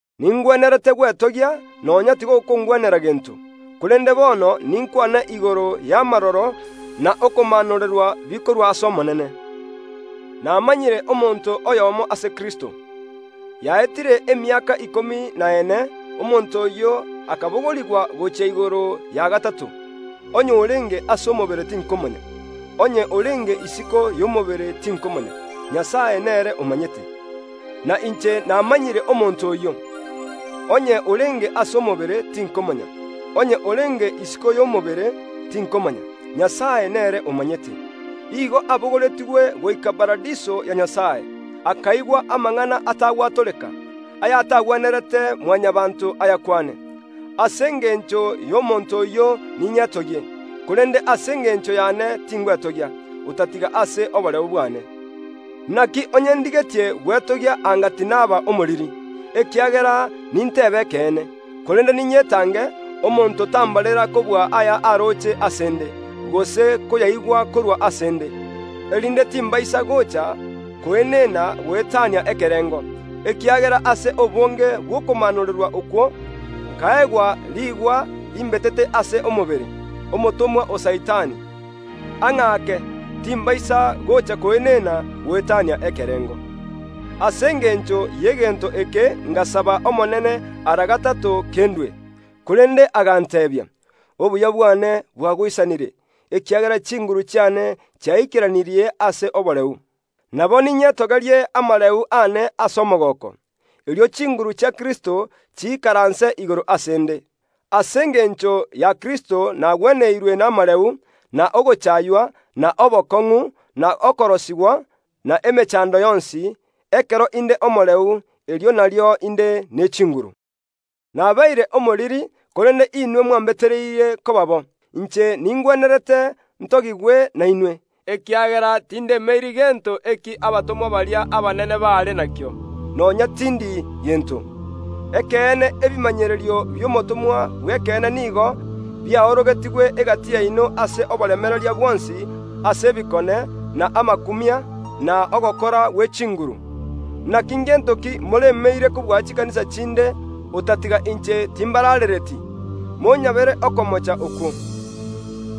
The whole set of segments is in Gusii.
Ningwenerete gwetogia, nonya tigokongwenera gento; korende bono ninkwane igoro y’amaroro na okomaanorerwa bikorwa ase Omonene. Namanyire omonto oyomo ase Kristo, yaetire emiaka ikomi na ene, omonto oyio akabogorigwa gochia igoro ya gatato, (onye orenge ase omobere tinkomanya, onye orenge isiko y’omobere tinkomanya, Nyasae nere omanyete). Na inche namanyire omonto oyio, (onye orenge ase omobere tinkomanya, onye orenge isiko y’omobere tinkomanya, Nyasae nere omanyete); igo abogoretigwe goika Paradiso ya Nyasae, akaigwa amang’ana atagwatoreka, ayatagwenerete Mwanyabaanto ayakwane. Ase engencho y’omonto oyio ninyetogie; korende ase engencho yane tingwetogia, otatiga ase oboreu bwane. Naki onye ndigetie gwetogia anga tinaba omoriri, ekiagera nintebe ekeene. Korende ninyetange, omonto tambarera kobua aya aroche ase ’nde, gose koyaigwa korwa ase ’nde. Erinde timbaisa gocha koenena goetania ekerengo, ekiagera ase obonge bw’okomaanorerwa okwo, nkaegwa riigwa rimbetete ase omobere, omotomwa o Saitani, ang’ake, timbaisa gocha koenena goetania ekerengo. Ase engencho y’egento eke ngasaba Omonene ara gatato kendue. Korende aganteebia, “Obuya bwane bwagoisanire, ekiagera chinguru chiane chiaikeranirie ase oboreu.” Nabo ninyetogerie amareu aane ase omogooko, erio chinguru chia Kristo chiikaranse igoro ase ’nde. Ase engencho ya Kristo nagweneirwe namareu, na ogochaaywa, na obokong’u, na okorosigwa, na emechando yonsi; ekero inde omoreu, erio nario inde ne chinguru. Nabeire omoriri, korende inwe mwambetereirie koba bo. Inche ningwenerete ntogigwe nainwe, ekiagera tindemeiri gento eki abatomwa baria abanene baare nakio, nonya tindi gento. Ekeene ebimanyererio bi’omotomwa bw’ekeene nigo biaorogetigwe egati yaino ase oboremereria bwonsi ase ebikone, na amakumia, na ogokora gwe chinguru. Naki ngento ki moremeire kobua chikanisa chinde, otatiga inche timbaraarereti? Monyabere okomocha okwo!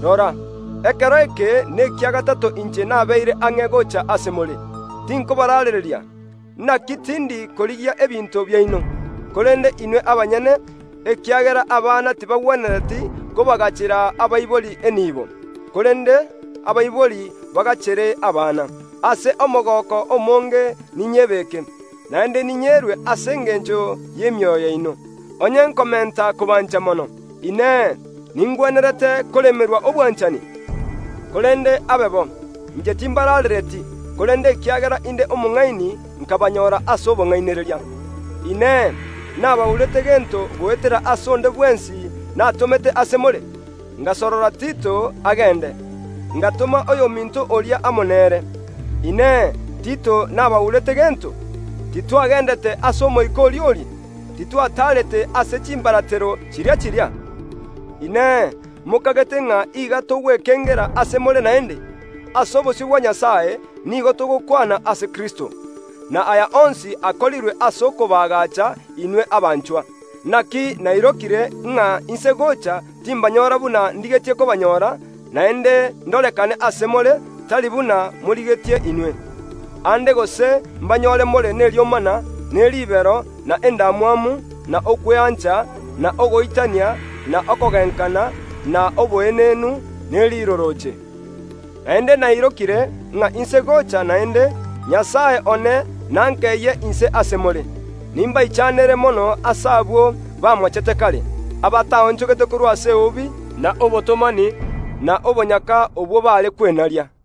Rora, ekero eke nekia gatato inche nabeire ang’e gocha ase more. Tinkobaraarereria, naki tindi korigia ebinto biaino, korende inwe abanyene, ekiagera abana tibagwenereti kobagachera abaibori enibo, korende abaibori bagachere abana. Ase omogooko omonge ninyebeke, naende ninyerue ase engencho y’emioyo yaino. Onye nkomenta kobancha mono, Inee, ningwenerete koremerwa obwanchani? Korende abe bo, inche timbaraarereti, korende ekiagera inde omong’aini nkabanyora ase obong’ainereria. Inee! Nabaurete gento goetera ase onde bwensi natomete ase more? Ngasorora Tito agende; ngatoma oyominto oria amo nere. Inee! Tito nabaurete gento? Titwagendete ase Omoika oria oria? Titwataarete ase chimbaratero chiria chiria? Inee! Mokagete ng’a iga togwekengera ase more naende? Ase obosio bwa Nyasae nigo togokwana ase Kristo. Na aya onsi akorirwe ase okobaagacha inwe abanchwa. Naki nairokire, ng’a inse gocha timbanyora buna ndigetie kobanyora; naende ndorekane ase more, tari buna morigetie inwe. Aande gose mbanyore more neriomana, ne ribero, na endamwamu, na okweancha, na ogoitania, na okogenkana, na oboenenu, ne rirorooche. Naende nairokire, ng’a inse gocha naende, Nyasae one nankeyie inse ase more, nimbaichanere mono ase abwo bamochete kare, abataonchogete korwa ase eubi, na obotomani, na obonyaka obwo bare kwenaria.